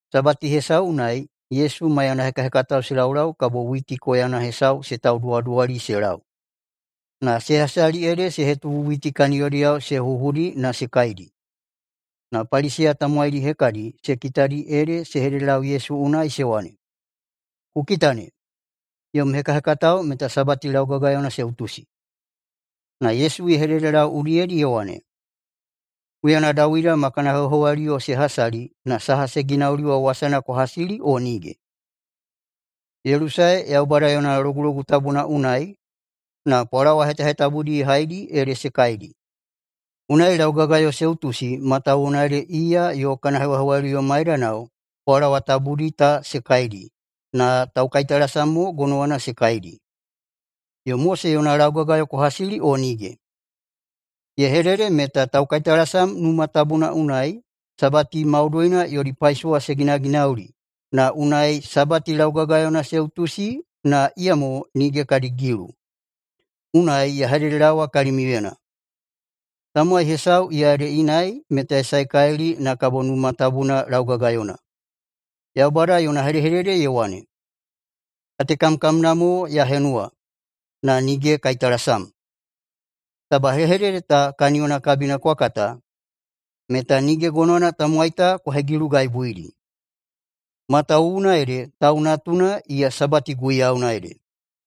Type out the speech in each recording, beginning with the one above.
Sabati hesau unai Yesu maiyana hekahekatao se laulau kabo witi koyana hesau se tauduwaduwali se lau. Na se hasali ede se hetubu witi kaniyodiyao se huhudi na se kaidi. Na Paliseya tamowaidi hekadi se kitadi ede se hededelau Yesu unai se wane, “Ku kita ne! Yom hekahekatao meta Sabati laugagayona se utusi!” Na Yesu ye hededelau udiyedi ye wane, “Huyana Dawida ma kana hewahewaliyo se hasali na saha ye ginauli wa wasana kwa hasili o nige? Ye lusae Yaubada yona Logulogu Tabuna unai na pwalawa hetahetabudi ye haidi ede se kaidi. Unai laugagayo se utusi matawuwuna ede iya yo kana hewahewaliyo maidanao wa pwalawa tabudi ta se kaidi, na taukaitalasam mo gonowana se kaidi. Yo [Mose yona] laugagayo kwa hasili o nige? Ye hedede meta taukaitalasam Numa Tabuna unai Sabati maudoina yodi paisowa se ginaginauli na unai Sabati laugagayona se utusi, na iyamo nige kadi gilu. Unai ya hededelaowa kalimiuyena: Tamowai hesau iya ede inai meta ye saekalili na kabo Numa Tabuna laugagayona. Yaubada yona hedehedede ye wane, ‘Katekamkamna mo ya henuwa, na nige kaitalasam.’ Taba hedehedede ta kaniyona kabina kwa kata, meta nige gonowana tamowai ta kwa hegilugaibuidi. Matawuwuna ede Tau Natuna iya Sabati guiyauna ede.”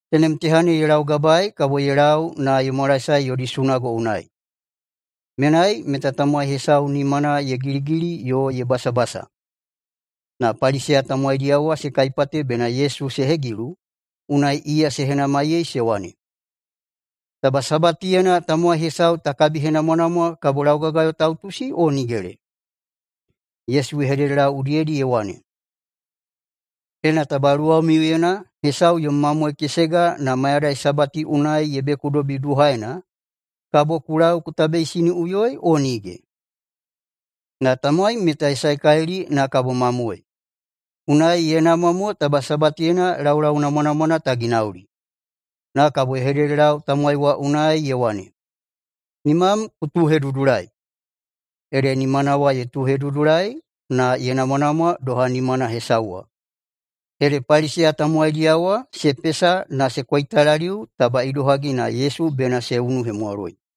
Tenem teha ne ye laugabae kabo ye lau na ye mwalaesae yodi sunago unai. Menai meta tamowai hesau nimana ye giligili yo ye basabasa. Na Paliseya tamowaidiyao wa se kaipate bena Yesu se hegilu, unai iya se henamaiyei se wane, “Taba Sabatiyena tamowai hesau ta kabihenamwanamwa, kabo laugagayo ta utusi o nigele?” Yesu ye hededelau udiyedi ye wane, “Ena taba luwamiuyena hesau yom mamoe kesega, na mayadai Sabati unai ye bekudobi duhaena, kabo ku lau ku tabeisiniꞌuyoi o nige? Na tamowai meta ye saekalili na kabo mamoe! Unai ye namwa mo taba Sabatiyena laulau namwanamwana ta ginauli.” Na kabo ye hededelau tamowai wa unai ye wane, “Nimam ku tuuhedudulai!” Ede nimana wa ye tuuhedudulai, na ye namwanamwa doha nimana hesauna wa. Ede Paliseya tamowaidiyao wa se pesa na se koitalaliu taba idohagi na Yesu bena se unuhemwaloi.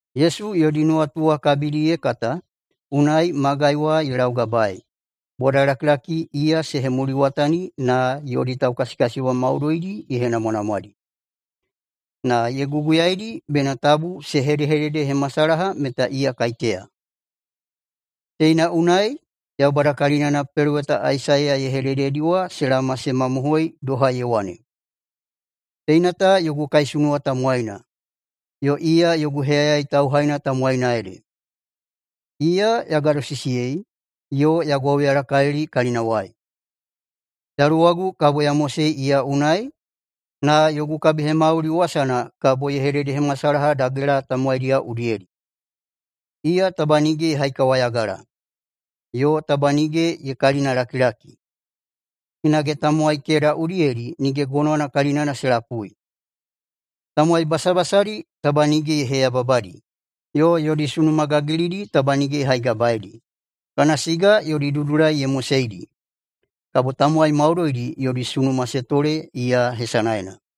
Yesu yodi nuwatu wa kabina ye kata, unai magai wa ye laugabaei. Bodalakilaki iya se hemuliwatani na yodi taukasikasiyebwa maudoidi ye henamwanamwadi. Na ye guguyaidi bena tabu se hedehededehemasalaha meta iya kaiteya. Teina unai Yaubada kalinana peloweta Aisaiya ye hedededi wa se laoma se mamohoi, doha ye wane, “Teina ta yogu kaisunuwa tamowaina, yo iya yogu heyayai tauhaina tamowaina ede. Iya ya gadosisiyei, yo ya gwauyalakalili kalinawai. Yaluwagu kabo ya mosei iya unai na yogu kabihemauli wasana kabo ye hededehemasalaha dagela tamowaidiyao udiyedi. Iya taba nige ye haikawayagala, yo taba nige ye kalinalakilaki. Hinage tamowai keda udiyedi nige gonowana kalinana se lapui. Tamowai basabasadi taba nige ye heyababadi, yo yodi sunuma gagilidi taba nige ye haigabaeidi kana siga yodi dudulai ye moseidi. Kabo tamowai maudoidi yodi sunuma se tole iya hesanaena.”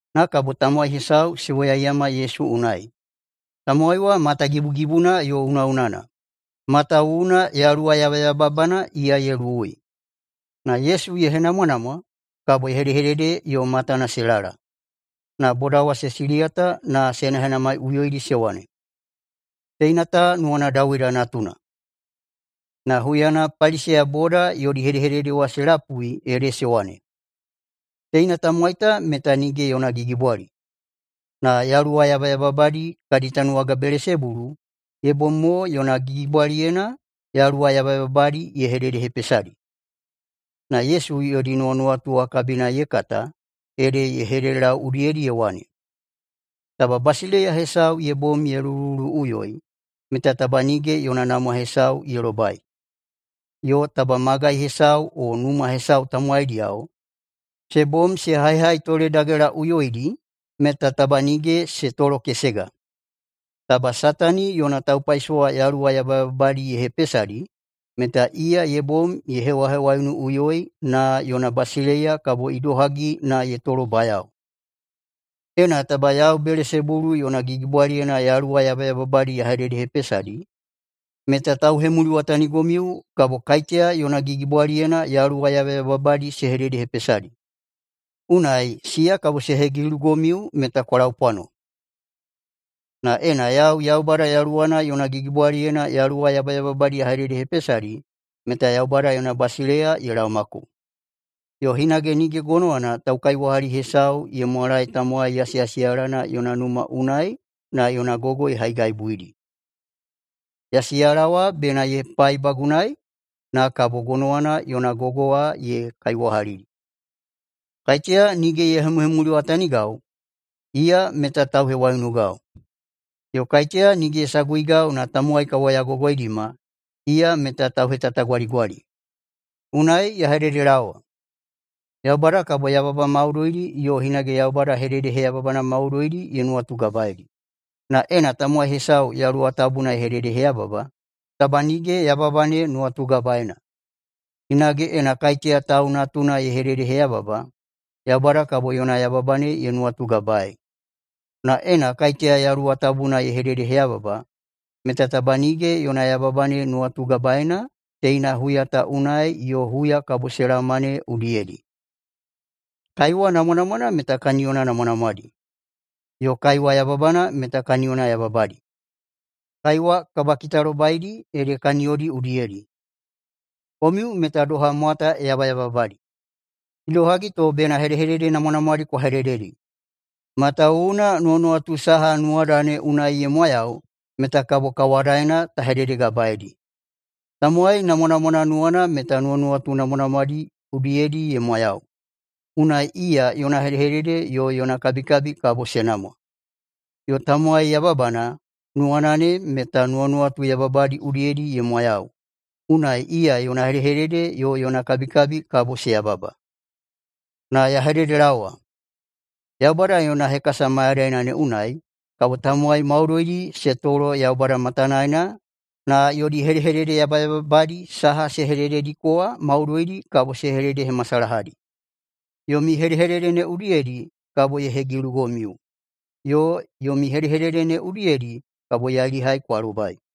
Na kabo tamowai hesau se woyaiyama Yesu unai. Tamowai wa matagibugibuna yo unaꞌunana, matawuwuna yaluwa yabayababana iya ye luwui. Na Yesu ye henamwanamwa, kabo ye hedehedede yo matana se lala. Na boda wa se siliyata na se henahenamaiꞌuyoidi se wane, “Teina ta nuwana Dawida Natuna?” Na huyana Paliseya boda yodi hedehedede wa se lapui ede se wane, “Teina tamowai ta meta nige yona gigibwali, na yaluwa yabayababadi kadi tanuwaga Belesebulu ye bom mo yona gigibwaliyena yaluwa yabayababadi ye hededehepesadi.” Na Yesu yodi nuwanuwatu wa kabina ye kata ede ye hededelau udiyedi ye wane, “Taba basileiya hesau ye bom ye lulululuꞌuyoi, meta taba nige yona namwa hesau ye lobai. Yo taba magai hesau o numa hesau tamowaidiyao se bom se haihaitoledagelaꞌuyoidi, meta taba nige se tolokesega. Taba Satani yona taupaisowa yaluwa yabayababadi ye hepesadi, meta iya ye bom ye hewahewaiunuꞌuyoi na yona basileiya kabo idohagi na ye tolobayao? Ena taba yau Belesebulu yona gigibwaliyena yaluwa yabayababadi ya hededehepesadi, meta tauhemuliwatanigomiu kabo kaiteya yona gigibwaliyena yaluwa yabayababadi se hededehepesadi? Unai siya kabo se hegilugomiu meta kwa laupwano. Na ena yau Yaubada Yaluwana yona gigibwaliyena yaluwa yabayababadi ya hededehepesadi, meta Yaubada yona basileiya ye laomako. Yo hinage nige gonowana taukaiwahali hesau ye mwalae tamowai yasiyasiyalana yona numa unai na yona gogo ye haigaibuidi. Yasiyala wa bena ye paibagunai, na kabo gonowana yona gogo wa ye kaiwahalidi. Kaiteya nige ye hemuhemuliwatanigau, iya meta tauhewaiunugau. Yo kaiteya nige ye saguigau na tamowai ka woyagogoidima, iya meta tauhetatagwaligwali. Unai ya hededelaowa, Yaubada kabo yababa maudoidi yo hinage Yaubada hededeheyababana maudoidi ye nuwatugabaeidi, na ena tamowai hesau Yaluwa Tabuna ye hededeheyababa, taba nige yababa ne nuwatugabaena. Hinage ena kaiteya Tau Natuna ye hededeheyababa, Yaubada kabo yona yababa ne ye nuwatugabaei. Na ena kaiteya Yaluwa Tabuna ye hededeheyababa, meta taba nige yona yababa ne nuwatugabaena teina huya ta unai yo huya kabo se laoma ne udiyedi. Kaiwa namwanamwana meta kaniyona namwanamwadi, yo kaiwa yababana meta kaniyona yababadi. Kaiwa kabakitalobaidi ede kaniyodi udiyedi. Komiu meta doha mwata yabayababadi! Idohagi to bena hedehedede namwanamwadi kwa hedededi? Matawuwuna nuwanuwatu saha nuwada ne unai ye mwayau meta kabo kawadaena ta hededegabaeidi. Tamowai namwanamwana nuwana meta nuwanuwatu namwanamwadi udiyedi ye mwayau, unai iya yona hedehedede yo yona kabikabi kabo se namwa. Yo tamowai yababana nuwana ne meta nuwanuwatu yababadi udiyedi ye mwayau, unai iya yona hedehedede yo yona kabikabi kabo se yababa. Na ya hededelaowa, Yaubada yona hekasa mayadaina ne unai kabo tamowai maudoidi se tolo Yaubada matanaena na yodi hedehedede yabayababadi saha se hededediko wa maudoidi kabo se hededehemasalahadi. Yomi hedehedede ne udiyedi kabo ye hegilugomiu, yo yomi hedehedede ne udiyedi kabo yailihai kwa lobai.”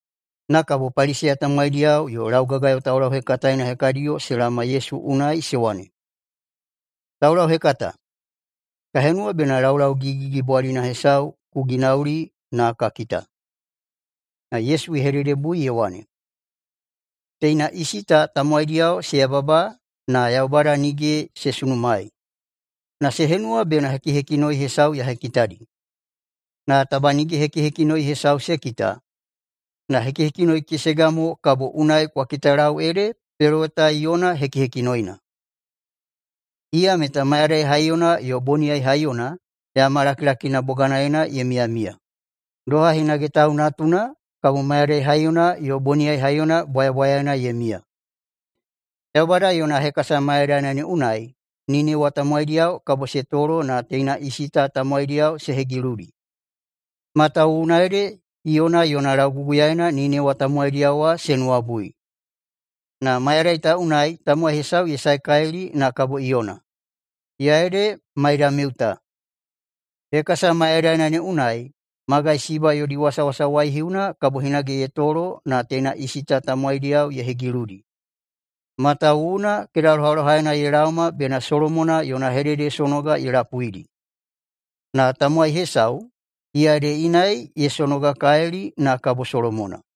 Na kabo Paliseya tamowaidiyao yo laugagayo taulauhekataena hekadiyo se laoma Yesu unai se wane, “Taulauhekata, ka henuwa bena laulau gigigigibwalina hesau ku ginauli na ka kita.” Na Yesu ye hededebui ye wane, “Teina isi ta tamowaidiyao se yababa na Yaubada nige se sunumaei na se henuwa bena hekihekinoi hesau ya hekitadi. Na taba nige hekihekinoi hesau se kita, na hekihekinoi kesega mo, kabo unai kwa kitalau ede peloweta Iyona hekihekinoina. Iya meta mayadai haiyona yo boniyai haiyona yama lakilakina boganaena ye miyamiya. Doha hinage Tau Natuna kabo mayadai haiyona yo boniyai haiyona bwayabwayaena ye miya. Yaubada yona hekasa mayadaina ne unai Ninewa tamowaidiyao kabo se tolo na teina isi ta tamowaidiyao se hegiludi, matawuwuna ede Iyona yona lauguguyaena Ninewa tamowaidiyao wa se nuwabui. Na mayadai ta unai tamowai hesau ye saekalili na kabo Iyona, iya ede maidamiu ta. Hekasa mayadaina ne unai magai Siba yodi wasawasa waihiuna kabo hinage ye tolo na teina isi ta tamowaidiyao ye hegiludi, matawuwuna kedalohalohaena ye laoma bena Solomona yona hededesonoga ye lapuidi. Na tamowai hesau iya ede inai, ye sonogakalili na kabo Solomona.”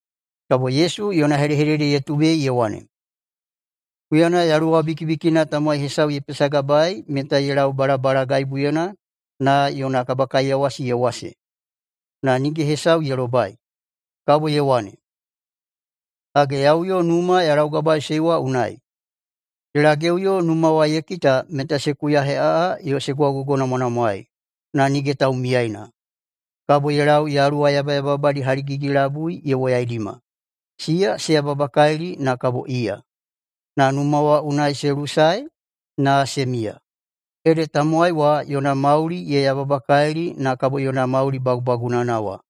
[Kabo Yesu yona hedehedede ye tubei ye wane,] “Huyana yaluwa bikibikina tamowai hesau ye pesagabaei meta ye lau balabalagaibuyena na yona kabakaiyawasi ye wase, na nige hesau ye lobai. Kabo ye wane, ‘Hage, ya uyo numa ya laugabaeiꞌusei wa unai.’ Ye lageꞌuyo numa wa ye kita meta se kuyaheꞌaꞌa yo se gwaugogonamwanamwaei, na nige taumiyaina. Kabo ye lau yaluwa yabayababadi haligigi-labui ye woyaidima. Siya se yababakalili na kabo iya, na numa wa unai se lusae na se miya. Ede tamowai wa yona mauli ye yababakalili na kabo yona mauli bagubagunana wa.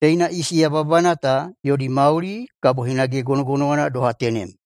Teina isi yababana ta yodi mauli kabo hinage gonogonowana doha tenem.”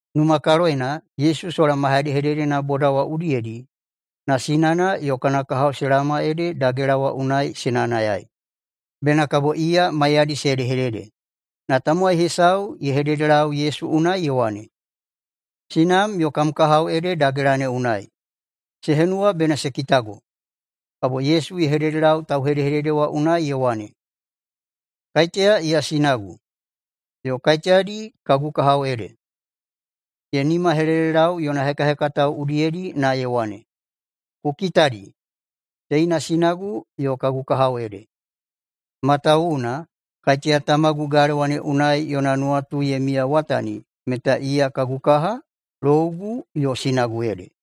Numakaloyena, Yesu sola ma hedehededena boda wa udiyedi, na sinana yo kana kahao se laoma ede dagela wa unai se nayanayai, bena kabo iya maiyadi se hedehedede. Na tamowai hesau ye hededelau Yesu unai ye wane, “Sinam yo kam kahao ede dagela ne unai, se henuwa bena se kitago.” Kabo Yesu ye hededelau tauhedehedede wa unai ye wane, “Kaiteya iya sinagu, yo kaiteyadi kagu kahao ede?” Ye nimahelelelau yona hekahekatao udiyedi na ye wane, “Ku kitadi, teina sinagu yo kagu kahao ede. Matawuwuna kaiteya Tamagu galewa ne unai yona nuwatu ye miyawatani meta iya kagu kaha, lougu, yo sinagu ede.”